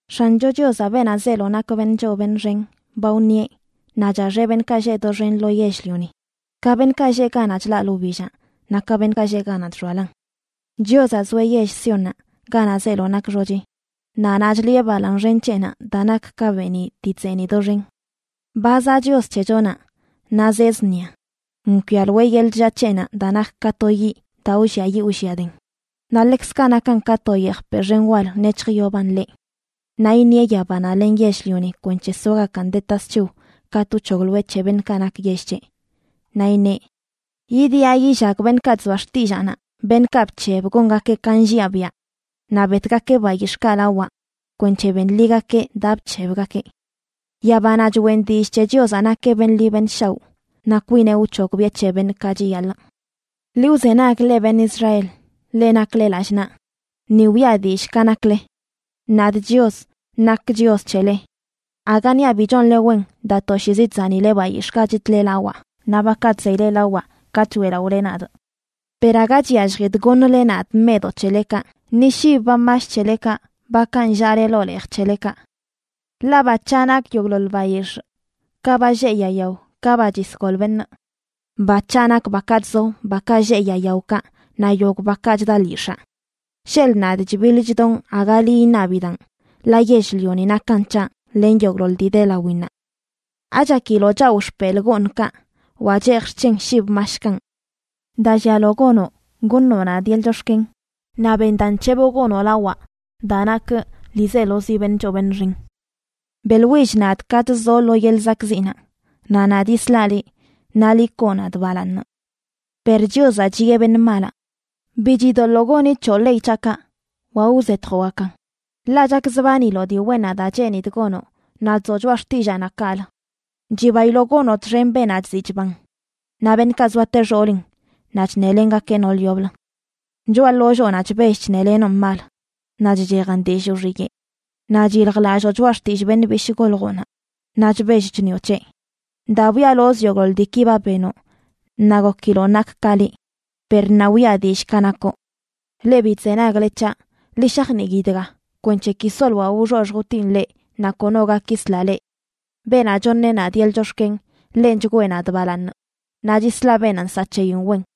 X̱ancho Chiozaꞌ, beenaꞌ zeelo nak beṉꞌ choo beṉꞌ xen, ba wṉieꞌ, naꞌ chaxeꞌ beṉꞌkaꞌ lleꞌ doxen lo yell-lioni, ka beṉꞌkaꞌ lleꞌ ganaꞌ chlaꞌlə wbillaꞌ naꞌ ka beṉꞌkaꞌ lleꞌ ganaꞌ chxoalan. Chiozaꞌ zoeꞌ yell Siónnaꞌ, ganaꞌ zeelo nak xochi, naꞌ naꞌ chliꞌe balaaṉ xen c̱heꞌnaꞌ daa nak ka beeniꞌ dii chzeeniꞌ doxen. Ba zaꞌ Chios c̱hechonaꞌ naꞌ zee zṉia, nkwialoeꞌ yeḻꞌ chllaa c̱heꞌnaꞌ daa nak ka to yiꞌ daa wlliayiꞌ wlliaden, naꞌ ḻekzkaꞌ nakan ka to yejpeꞌ xen wal nec̱hjyoban ḻeꞌ. Naꞌ iṉieꞌ yabanaꞌ len yell-lioni kwenc̱he soagakan de tasc̱hiw katꞌ wc̱hogloeꞌ c̱he beṉꞌkaꞌ nak yell c̱heꞌ. Naꞌ iṉeꞌ: “Yidiꞌa yillag beṉꞌkaꞌ chzoa xtillaanaꞌ, beṉꞌkaꞌ bc̱heb gongakeꞌ ka nlliaꞌ biaꞌ, naꞌ betgakeꞌ bayix̱ꞌkaꞌ lawaꞌ kwenc̱he benḻigakeꞌ daa bc̱hebgakeꞌ.” Yabanaꞌ choꞌen dillꞌ c̱he Chiozaꞌ nakeꞌ beṉꞌ ḻi beṉꞌ shaoꞌ, naꞌ kwineꞌ wc̱hogbiꞌe c̱he beṉꞌ ka chiyaḻꞌ. “Ḻi wzenag, leꞌ beṉꞌ Israel, leꞌ nakle lallꞌ naꞌ, ni wiꞌa dillꞌ ka nakle. Nadꞌ Chios, nakꞌ Chios c̱hele. Aga niaꞌ bi chonle wen daa toshiizi chzanileꞌ bayix̱ꞌkaꞌ chitle lawaꞌ, naꞌ bakaꞌ chzeyle lawaꞌ katꞌ choeꞌlaꞌole nadꞌ. Per aga chyalljidꞌ goṉle nadꞌ meꞌdoꞌ c̱helekaꞌ, ni shib ba mash c̱helekaꞌ, bakaꞌ nllaꞌle ḻoo leej c̱helekaꞌ. Ḻaꞌ ba c̱haꞌ nak yogꞌḻoḻ bayix̱ꞌ, ka ba lleꞌ yaa yao ka ba chisgol beṉꞌ. Ba c̱haꞌ nak bakaꞌ chzo, bakaꞌ lleꞌ yaa yaokaꞌ, naꞌ yogꞌ bakaꞌ chda lyix̱aa. Sheḻꞌ nadꞌ chbiḻ chdonꞌ, aga liꞌ iṉabidaꞌn, ḻaꞌ yell-lioni nakan c̱haꞌ len yogꞌḻoḻ dii de lawinnaꞌ. ¿Achakiloꞌ chawꞌ xpelꞌ gooṉkaꞌ, wa cheejꞌ xc̱hen shib mashkanꞌ? Daa llialo gonoꞌ, goṉoꞌ nadꞌ yeḻꞌ chox̱ken; naꞌ ben daa nc̱heboꞌ gonoꞌ lawaꞌ daa nakꞌ ḻiizelozi beṉꞌ choo beṉꞌ xen. Beꞌḻwill nadꞌ katꞌ zoꞌ lo yeḻꞌ zakꞌziꞌnaꞌ, naꞌ nadꞌ yislaꞌ liꞌ, naꞌ liꞌ koo nadꞌ balaaṉ.” Per Chiozaꞌ chiꞌe beṉꞌ malaꞌ: “Bi chidoḻoo goni c̱hoꞌ ley c̱haꞌkaꞌ, wa wzetjoꞌgakan. Ḻaꞌ chakzbaniloꞌ dii wennaꞌ daa cheenidꞌ gonoꞌ, naꞌ chzoꞌ choꞌa xtillaanaꞌ kaꞌlə. Chibailoꞌ gonoꞌ txen beenaꞌ chziꞌ chban, naꞌ beṉꞌkaꞌ zoate xoolin naꞌ chṉelengakeꞌ nool yoblə. Choꞌa ḻolloonaꞌ chbell chṉelenoꞌn mal, naꞌ chchejan dillꞌ wxiyeꞌ. Naꞌ chyiljlalloo choꞌa xtillꞌ beṉꞌ bishꞌ goljoꞌnaꞌ, naꞌ chbell chṉioꞌ c̱heꞌ. Daa bwialozꞌ yogꞌḻoḻ diiki ba benoꞌ, naꞌ gokiloꞌ nakꞌ ka liꞌ. Per ṉaa wiꞌa dillꞌ ka nakoꞌ. “Leꞌ bi chzenagle c̱haꞌ, ḻi shajnii dga, kwenc̱he ki soloaꞌ wxoxj wtinꞌ leꞌ, naꞌ kono gak yisla leꞌ. Beenaꞌ choṉeꞌ nadꞌ yeḻꞌ chox̱ken, ḻenꞌ chgwee nadꞌ balaaṉ. Naꞌ chislaꞌ beenaꞌ nsaꞌ c̱heyin wen.”